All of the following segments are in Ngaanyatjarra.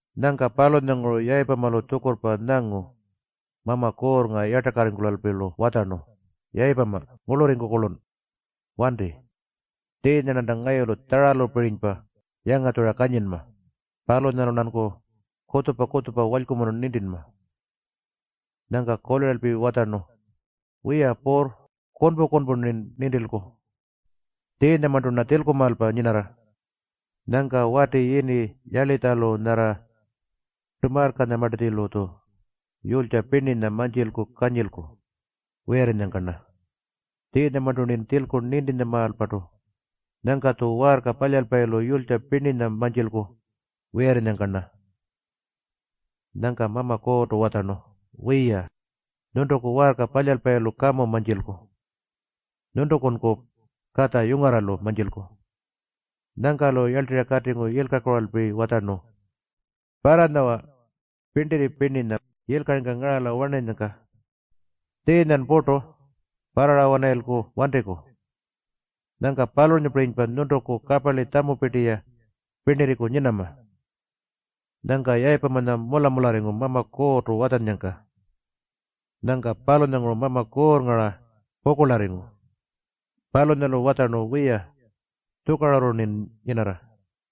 Nyangka palunyalanguru Yayipamalu tjukurrpa nyangu Mama Kuurrnga yartakarringkulalpi-lu watjarnu, “Yayipama, ngurlurriku-kurlun. Wanti. Tjiinya-rnanta ngayulu tjaralupirinypa yangatjura kanyinma. Palunyalu-rnanku kutjupa-kutjupa walykumunu nintinma.” Nyangka kuliralpi watjarnu, “Wiya Puurr, kunpu-kunpu-rnin nintilku. Tjiinyamarntu-rna tjilkumaalpa nyinarra. Nyangka wati yini Yalitjalu nyarra Tamarrkanyamartatjilu-tju yulytja pirninya mantjilku kanyilku wiyarrinyangka-rna. Tjiinyamarntu-rnin tjilku nintintjamaalpartu. Nyangka-tju waarka palyalpayilu yulytja pirninya mantjilku wiyarrinyangka-rna.” Nyangka Mama Kuurrtu watjarnu, “Wiya, nyuntuku waarka palyalpayilu kamu mantjilku. Nyuntukunku katja yungarralu mantjilku.” Nyangka-lu yarltirra katingu yilkakuralpi watjarnu, “Parranyawa pirntirri yilkaringka ngaralanyangka. Tjiinyan purtu parrara-wanarayilku wantiku. Nyangka palunyapirinypa nyuntuku kaparli tjamupirti-ya pirnirriku nyinama.” Nyangka Yayipamanya mula-mularringu Mama Kuurrtu watjannyangka. Nyangka palunyanguru Mama Kuurrnga-ra pukurlarringu. Palunyalu watjarnu, “Wiya, tjukarurru-rnin nyinarra.”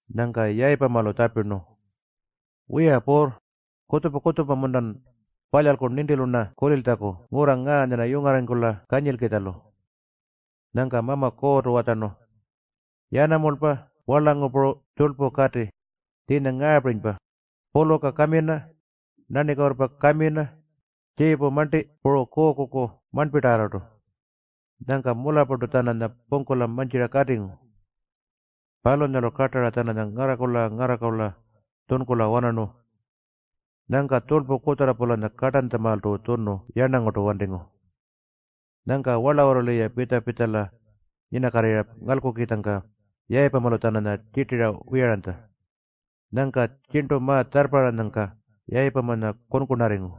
Nyangka Yayipamalu tjapirnu, “Wiya Puurr, kutjupa-kutjupa-muntan palyalku nintilu-rna kuliltjaku ngurra ngaanya-rna yungarrarringkula kanyilkitjalu?” Nyangka Mama Kuurrtu watjarnu, “Yanamulpa warlangu puru tjurlpu kati, tjiinya ngaapirinypa; puluka kamina, nanikuurrpa kamina, tjiipu marnti puru tjurlpu kuukuku marnpitarrartu.” Nyangka mularrpartu-tjananya pungkula mantjira katingu. Palunyalu kartara-tjananya ngarrakurla-ngarrakurla tjunkula-wanarnu. Nyangka tjurlpu kutjarra-pulanya kartantjamaaltu tjunu yarnangurtu wantingu. Nyangka warlawurru-ya pitja-pitjala nyinakatirra ngalkukitjangka Yayipamalu-tjananya tjirtira wiyaranytja. Nyangka tjirntu ma-tjarrparranyangka Yayipamanya kunkunarringu.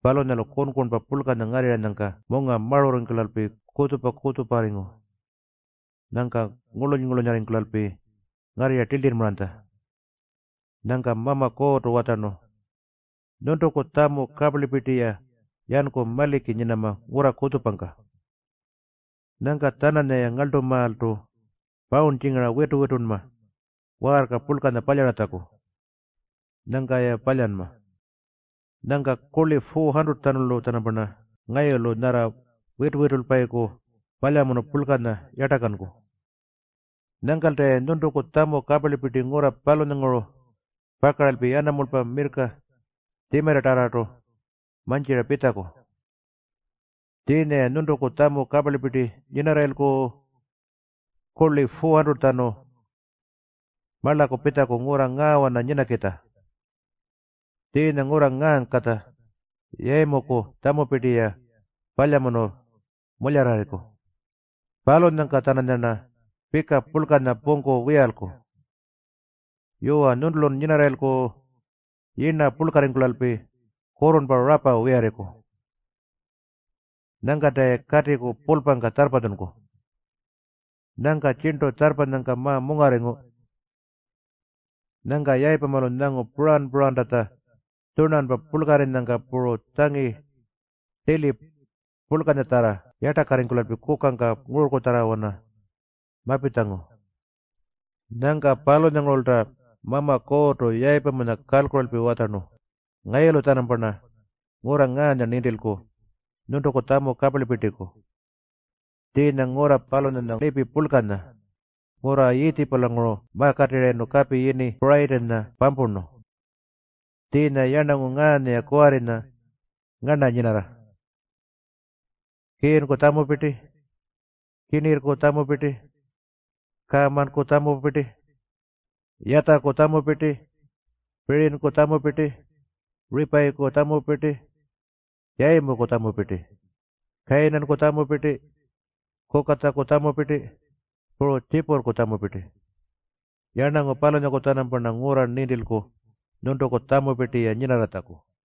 Palunyalu kunkunpa purlkanya ngarrirranyangka munga marurringkulalpi kutjupa-kutjuparringu. Nyangka ngurluny-ngurlunyarringkulalpi ngarrirra tiltirrmaranytja. Nyangka Mama Kuurrtu watjarnu, “Nyuntuku tjamu kaparlipirti-ya yanku ngurra kutjupangka maliki nyinama. Nyangka-tjananyaya ngarltumaaltu pawurntjingara witu-witunma waarka purlkanya palyaratjaku. Nyangka-ya palyanma. Nyangka kurli 400-tjanulu-tjanamparna ngayulu nyarra witu-witulpayiku palyamunu purlkanya yartakanku. Nyangkalta-ya nyuntuku tjamu kaparlipirti ngurra palunyalanguru pakaralpi yanamulpa, mirrka puru tjimarritarrartu mantjira pitjaku. Tjiinya-ya nyuntuku tjamu kaparlipirti nyinarrayilku kurli 400-tjanu marlaku pitjaku ngurra ngaawana nyinakitja. Tjiinya ngurra ngaangkatja Yayimuku tjamupirti-ya palyamunu mularrarriku. Palunyangka-tjananyarna pika purlkanya pungku wiyalku. Yuwa, nyuntulun nyinarrayilku yirna purlkarringkulalpi kurrurnpa rapa wiyarriku. Nyangkanta-ya katiku pulpangka tjarrpatjunku.” Nyangka tjirntu tjarrpanyangka ma-mungarringu. Nyangka Yayipamalu nyangu puran-purantatja tjunarnpa purlkarrinyangka puru tjangi tili purlkanyatjarra yartakarringkulalpi kukangka ngururrkutjarrawana mapitjangu. Nyangka palunyangurulta Mama Kuurrtu Yayipamanya kalkuralpi watjarnu, “Ngayulu-tjanamparna ngurra ngaanya nintilku nyuntuku tjamu kaparlipirtiku. Tjiinya ngurra palunyanya lipi purlkanya, ngurra Yiitjipulanguru makatirrayirnu kapi yini Purayitinya pampurnu. Tjiinya yarnangu ngaanya-ya kuwarrinya ngarna nyinarra: Kiinku tjamupirti, Kinirrku tjamupirti, Karrmanku tjamupirti, Yatjaku tjamupirti, Pirinyku tjamupirti, Ripayiku tjamupirti, Yayimuku tjamupirti, Kayinanku tjamupirti, Kukatjaku tjamupirti, puru Tjipurrku tjamupirti. Yarnangu palunyaku-tjanampa ngurra-rna nintilku nyuntuku tjamupirti-ya nyinarratjaku.”